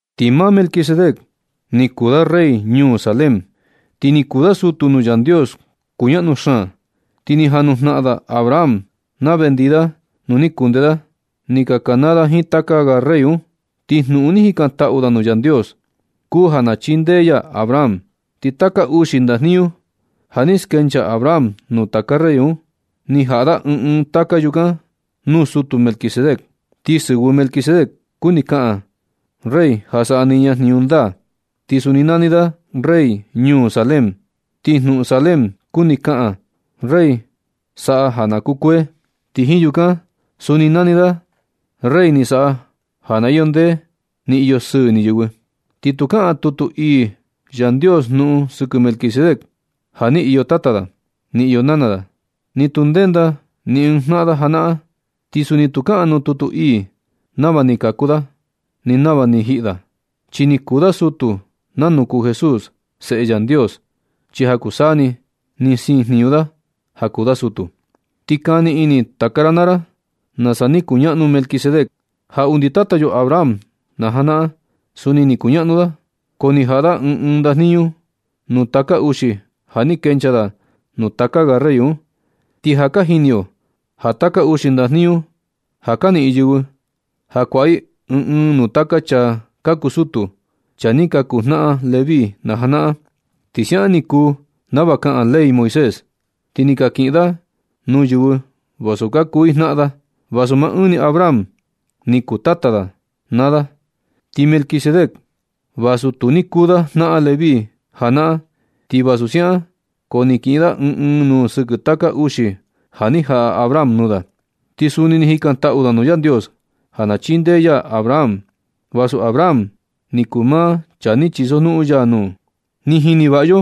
Ti maa Melquisedec ni kuu da rey ñuu Salem, ti ni kuu da sutu nuu Yandios kuñaꞌnu xaan. Ti ni jan nujnaꞌan da Abraham na vendii da nu ni kundee da ni ka kanaa da jiin taka ga rey un, ti jnuꞌun ni jikantaꞌu da nuu Yandios kuu ja na chindee ya Abraham. Ti taka uxi ndajniñu ja ni skenchaa Abraham nuu taka rey un, ni jaꞌa da ɨɨn ɨɨn taka yukan nuu sutu Melquisedec. Ti sɨvɨ Melquisedec kuni kaꞌan “Rey ja saꞌa niña jniñu ndaa.” Ti suni nani da rey ñuu Salem, ti jnuꞌun Salem kuni kaꞌan “Rey saꞌa ja na kukuee.” Ti jiin yukan suni nani da: “Rey ni saꞌa ja ni iyo ndee, ni iyo sɨɨ ini yɨvɨ.” Ti tu kaꞌan tutu ii Yandios jnuꞌun sɨkɨ Melquisedec ja ni iyo tata da, ni iyo nana da, ni tu ndenda ni ɨɨn jnaꞌan da janaꞌan. Ti suni tu kaꞌan nuu tutu ii nama ni kaku da, ni nama ni jiꞌi da. Chi ni kuu da sutu nanu kuu Jesús, Seꞌe Yandios, chi ja kuu saa ni ni siin jniñu da ja kuu da sutu. Ti kani ini taka ra naa ra nasa ni kuñaꞌnu Melquisedec, ja undi tata yo Abraham najanaꞌan. Suni ni kuñaꞌnu da, ko ni jaꞌa da ɨɨn ɨɨn ndajniñu nuu taka uxi ja ni kenchaa da nuu taka ga rey un. Ti ja ka jini yo ja taka uxi ndajniñu ja ka niꞌin yɨvɨ, na kuaꞌa i ɨɨn ɨɨn nuu taka chaa ka kuu sutu, chaa ni ka kuu jnaꞌan Leví najanaꞌan. Ti siaꞌan ni kuu nava kaꞌan ley Moisés. Ti ni ka kiꞌin da nuu yɨvɨ vasu ka kuu i jnaꞌan da, vasu maa ɨɨn ni Abraham ni kuu tata da naa da. Ti Melquisedec vasu tu ni kuu da jnaꞌan Leví janaꞌan, ti vasu siaꞌan, ko ni kiꞌin da ɨɨn ɨɨn nuu sɨkɨ taka uxi ja ni jaꞌa Abraham nuu da. Ti suni ni jikantaꞌu da nuu Yandios ja na chindee ya Abraham, vasu Abraham ni kuu maa chaa ni chisojnuꞌun ya nuu. Ti jini vaꞌa yo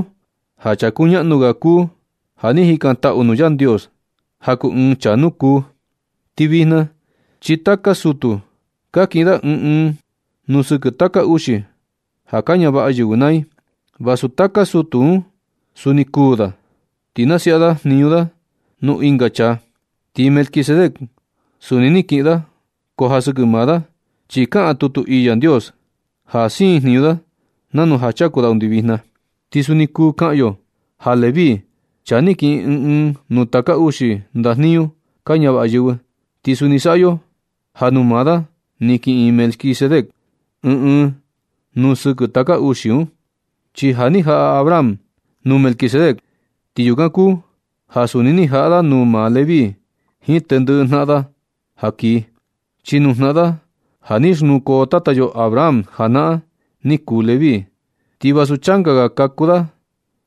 ja chaa kuñaꞌnu ga kuu ja ni jikantaꞌu nuu Yandios ja kuu ɨɨn chaa nukuu. Ti vijna chi taka sutu ka kiꞌin da ɨɨn ɨɨn nuu sɨkɨ taka uxi ja ka ñavaꞌa yɨvɨ naa i, vasu taka sutu un suni kuū da, ti nasiaꞌa da jniñu da nuu ɨnga chaa. Ti Melquisedec suni ni kiꞌin da, ko ja sɨkɨ maa da chi kaꞌan tutu ii Yandios ja siin jniñu da nanu ja chaku da undi vijna. Ti suni kuu kaꞌan yo ja Leví, chaa ni kiꞌin ɨɨn ɨɨn nuu taka uxi ndajniñu ka ñavaꞌa yɨvɨ, ti suni saꞌa yo ja nuu maa da ni kiꞌin Melquisedec ɨɨn ɨɨn nuu sɨkɨ taka uxi un. Chi ja ni jaꞌa Abraham nuu Melquisedec, ti yukan kuu ja suni ja ni jaꞌa da nuu maa Leví jiin tendɨꞌɨ jnaꞌan da ja kii. Chi nuu jnaꞌan da ja ni xnukoo tata yo Abraham janaꞌan ni kuu Leví, ti vasu changa ga kaku da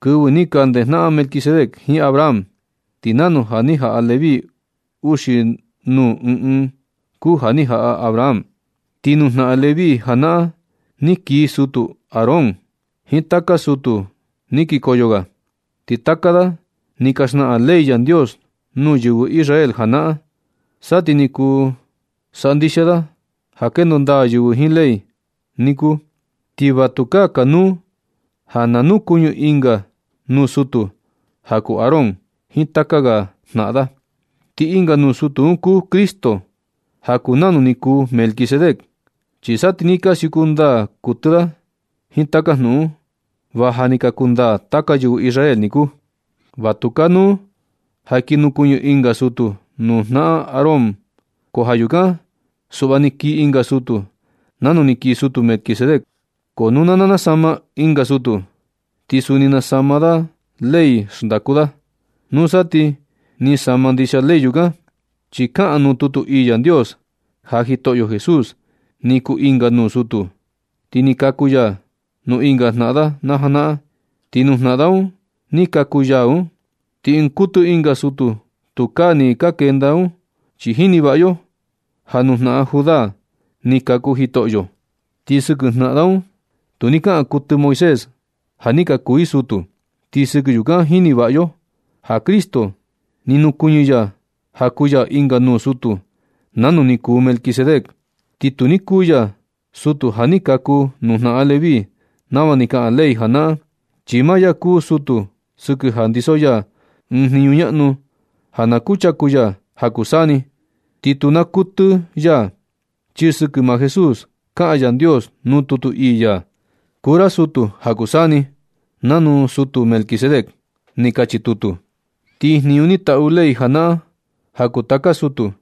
kɨvɨ ni ka ndejnaꞌan Melquisedec jiin Abraham. Ti nanu ja ni jaꞌa Leví uxi nuu ɨɨn ɨɨn un kuu ja ni jaꞌa Abraham. Ti nuu jnaꞌan Leví janaꞌan ni kii sutu Aarón jiin taka sutu ni kikoyo ga. Ti taka da ni ka xnaꞌan ley Yandios nuu yɨvɨ Israel janaꞌan. Sa ti ni kuu saꞌa ndixia da ja kendo ndaa yɨvɨ jiin ley un niku, ti va tukaa kanuu ja na nukuɨñɨ ɨnga nuu sutu ja kuu Aarón jiin taka ga jnaꞌan da. Ti ɨnga nuu sutu un kuu Cristo ja kuu nanu ni kuu Melquisedec. Chi sa ti ni ka siuku ndaa ndɨ kuɨtɨ da jiin taka jnuꞌun un, va ja ni ka kundaa taka yɨvɨ Israel niku. Va tu kanuu ja kii nukuɨñɨ ɨnga sutu nuu jnaꞌan Aarón, ko ja yukan suꞌva ni kii ɨnga sutu nanu ni kii sutu Melquisedec. Ko nu na nasama ɨnga sutu, ti suni nasama da ley xndaku da. Nusa ti ni sama ndixia ley yukan, chi kaꞌan nuu tutu ii Yandios ja Jitoꞌo Jesús ni kuu ɨnga nuu sutu, ti ni kaku ya nuu ɨnga jnaꞌan da janaꞌan, ti nuu jnaꞌan da un ni kaku ya un, ni ɨɨn kuɨtɨ ɨnga sutu tukaa ni ka kenda un. Chi jini vaꞌa yo ja nuu jnaꞌan Judá ni kaku Jitoꞌo. Ti sɨkɨ jnaꞌan un tu ni kaꞌan kuɨtɨ Moisés ja ni ka kuu i sutu. Ti sɨkɨ yukan jini vaꞌa yo ja Cristo ni nukuɨñɨ ya ja kuu ya ɨnga nuu sutu nanu ni kuu Melquisedec. Ti tu ni kuu ya sutu ja ni ka kaku nuu jnaꞌan Leví nava ni kaꞌan ley janaꞌan, chi maa ya kuu sutu sɨkɨ ja ndiso ya ɨɨn jniñu ñaꞌnu ja na kuchaku ya ja kuu saa ni, ti tu naa kuɨtɨ ya. Chi sɨkɨ maa Jesús kaꞌan Yandios nuu tutu ii ya: Kuu ra sutu ja kuu saa ni, nanu sutu Melquisedec. Ni kachi tutu. Ti jniñu ni taꞌu ley janaꞌan ja kuu taka sutu,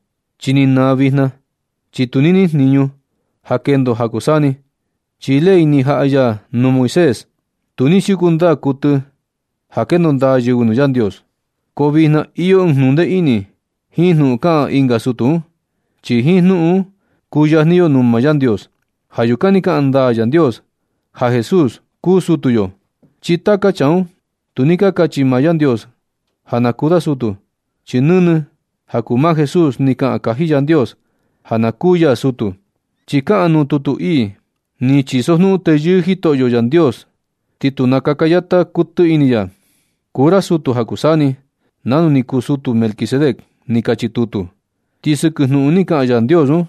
chi ni naa vijna, chi tu ni niꞌin jniñu ja kendo ja kuu saa ni. Chi ley ni jaꞌa ya nuu Moisés, tu ni siuku ndaa kuɨtɨ un ja kendo ndaa yɨvɨ nuu Yandios. Ko vijna iyo ɨɨn jnuꞌun ndee ini jiin jnuꞌun kaꞌan ɨnga sutu un, chi jiin jnuꞌun un kuyajni yo nuu maa Yandios. Ja yukan ni kaꞌan ndaa Yandios ja Jesús kuu sutu yo. Chi taka chaa un, tu ni kachi maa Yandios ja na kuu da sutu. Chi nɨnɨ ja kuu maa Jesús ni kaꞌan kaji Yandios ja na kuu ya sutu, chi kaꞌan nuu tutu ii: Ni chisojnuꞌun teyɨɨ Jitoꞌo Yandios, ti tu nakaka yata kuɨtɨ ini ya. Kuu ra sutu ja kuu saa ni, nanu ni kuu sutu Melquisedec. Ni kachi tutu. Ti sɨkɨ jnuꞌun ni kaꞌan Yandios un,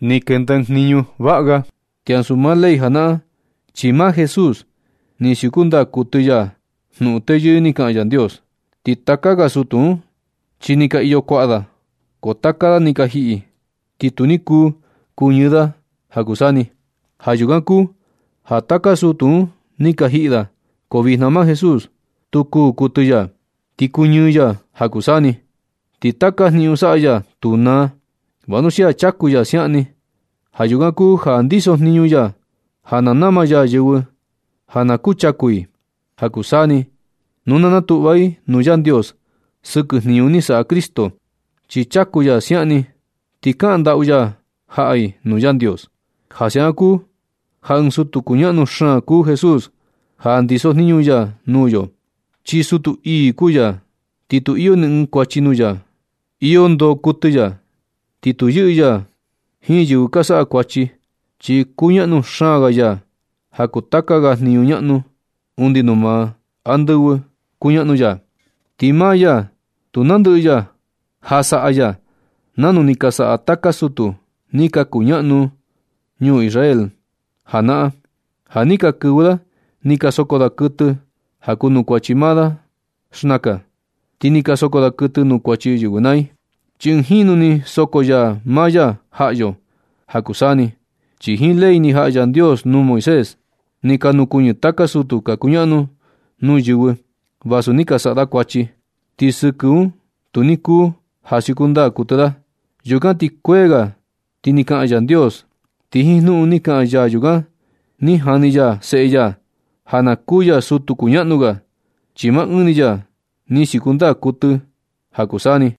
ni kenda ɨɨn jniñu vaꞌa ga ti ansu maa ley janaꞌan, chi maa Jesús ni siuku ndaa kuɨtɨ ya jnuꞌun teyɨɨ ni kaꞌan Yandios. Ti taka ga sutu un, chi ni ka iyo kuaꞌa da, ko taka da ni ka jiꞌi, ti tu ni kuu kuñɨɨ da ja kuu saa ni. Ja yukan kuu ja taka sutu un ni ka jiꞌi da, ko vijna maa Jesús tu kuú kuɨtɨ ya, ti kuñɨɨ ya ja kuu saa ni. Ti taka jniñu saꞌa ya tu naa, vanuxia chaku ya siaꞌan ni. Ja yukan kuu ja ndiso jniñu ya ja na nama ya yɨvɨ ja na kuchaku i ja kuu saa ni nu na natuꞌva i nuu Yandios sɨkɨ jniñu ni saꞌa Cristo. Chi chaku ya siaꞌan ni ti kaꞌan ndaꞌu ya jaꞌa i nuu Yandios. Ja siaꞌan kuu ja ɨɨn sutu kuñaꞌnu xaan kuu Jesús ja ndiso jniñu ya nuu yo. Chi sutu ii kuu ya, ti tu iyo ni ɨɨn kuachi nuu ya, iyo ndoo kuɨtɨ ya, ti tu yɨꞌɨ ya jiin yɨvɨ ka saꞌa kuachi, chi kuñaꞌnu xaan ga ya ja kuu taka ga jniñu ñaꞌnu, undi nuu maa andɨvɨ kuñaꞌnu ya. Ti maa ya tu nandɨꞌɨ ya ja saꞌa ya nanu ni ka saꞌa taka sutu ni ka kuñaꞌnu Israel janaꞌan, ja ni ka kɨvɨ da ni ka soko da kuɨtɨ ja kuu nuu kuachi maa da xnakan, ti ni ka soko da kuɨtɨ nuu kuachi yɨvɨ naa i. Chi ɨɨn jinu ni soko ya maa ya jaꞌa yo ja kuu saa ni. Chi jiin ley ni jaꞌa Yandios nuu Moisés, ni ka nukuɨñɨ taka sutu ka kuñaꞌnu nuu yɨvɨ vasu ni ka saꞌa da kuachi, ti sɨkɨ un tu ni kuu ja siuku ndaa kuɨtɨ da. Yukan ti kuee ga ti ni kaꞌan Yandios. Ti jiin jnuꞌun ni kaꞌan ya yukan, ni jani ya Seꞌe ya ja na kuu ya sutu kuñaꞌnu ga, chi maa ɨɨn ni ya ni siuku ndaa kuɨtɨ ja kuu saa ni.